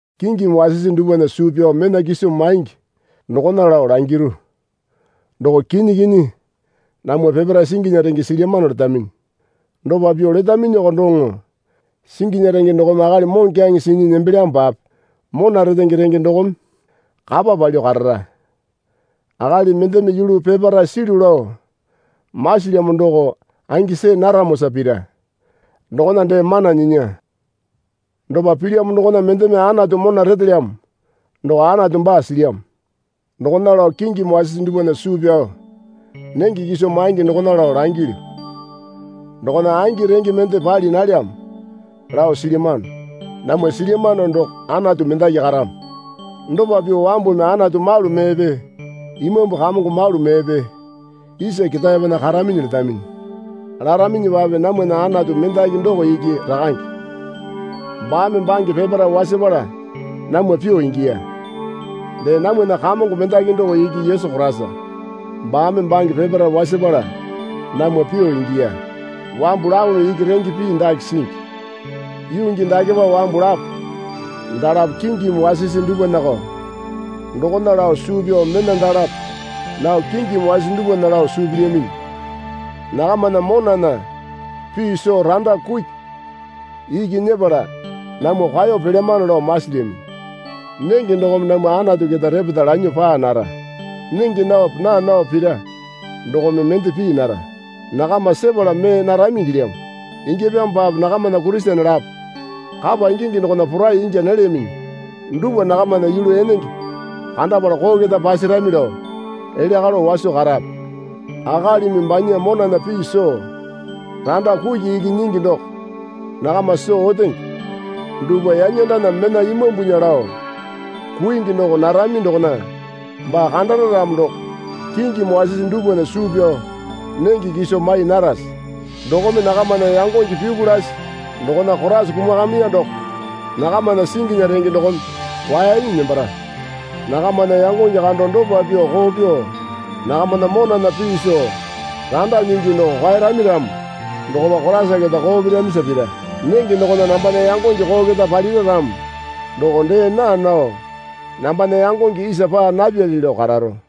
Kingimi wasisi dupwana suu pyao mena kiso maingi dokona lao langiru. Doko kinyi kinyi, Namwa peparae singinya renge silyamano letaminyi. Dopa pyuo letaminyiko doŋo singinya renge dokome akali moŋokyaŋe sinyi nembelyamopape mona retenge renge dokome kapa palyuo karara. Akali mendeme yulu peparae silyu lao masilyamo doko angi see naramosa pira dokona dee mana nyinya. Dopa pilyamo dokona mendeme Anatu mona retelyamo doko Anatu baa silyamo. Dokona lao kingimi wasisi dupwana suu pyao nenge kiso maingi dokona lao langilyu. Dokona angi renge mende pali nalyamo lao silyamano. Namwa silyamano doko Anatu mendaki karamo. Dopa pyuo wambumi Anatu malu meepe imambu kamongo malu meepe isa ketaepena karaminyi letaminyi. Laraminyipape namwana Anatu mendaki doko iki Rakange. Baame bange peparae wasapala namwa pyuo ingiya. Dee namwana Kamongo mendaki doko iki Yesu Koraisa. Baame bange peparae wasapala namwa pyuo ingiya. Wambu lapome iki renge pii dake singi. Yuu gii dakepa wambu lapo dalapo kingimi wasisi dupwanako dokona lao suu pyao mena dalapo nao kingimi wasisi dupwana lao suu pilyaminyi. Nakamana monana pii soo randa kuki iki nyepala namwa kwao pelyamano lao masilyaminyi. Nenge dokome namwa Anatu keta repeta lanyuo paa nara. Nenge naope naa naope pira, dokome mende pii nara. Nakama sepala mee narami ingilyamo. Ingyapyamopape nakamana Kurisene lapo kapa ingingi dokona porai ingya nalyaminyi dupwa nakamana yulu enenge kandapala koo keta pasarami lao elya kalo waso karape. Akalimi banya monana pii soo randa kuki iki nyingi doko nakama soo otenge dupwa yanyandana mena imambunya lao kuingi doko narami dokona baa kandara ramo doko kingimi wasisi dupwana suu pyao nenge kiso mai narase? Dokome nakamana yangonge pyuku lasi dokona Koraisa kumakamiya doko nakamana singinya renge dokome kwaenyi nembara. Nakamana yangonge kando dopa pyuo koo pyuo nakamana monana pii soo randa nyingi doko kwaerami ramo dokopa Koraisa keta koo piramisa pira. Nenge dokona nambana yangonge koo keta palira ramo doko dee naa nao nambana yangonge isa paa napyali lao kararo.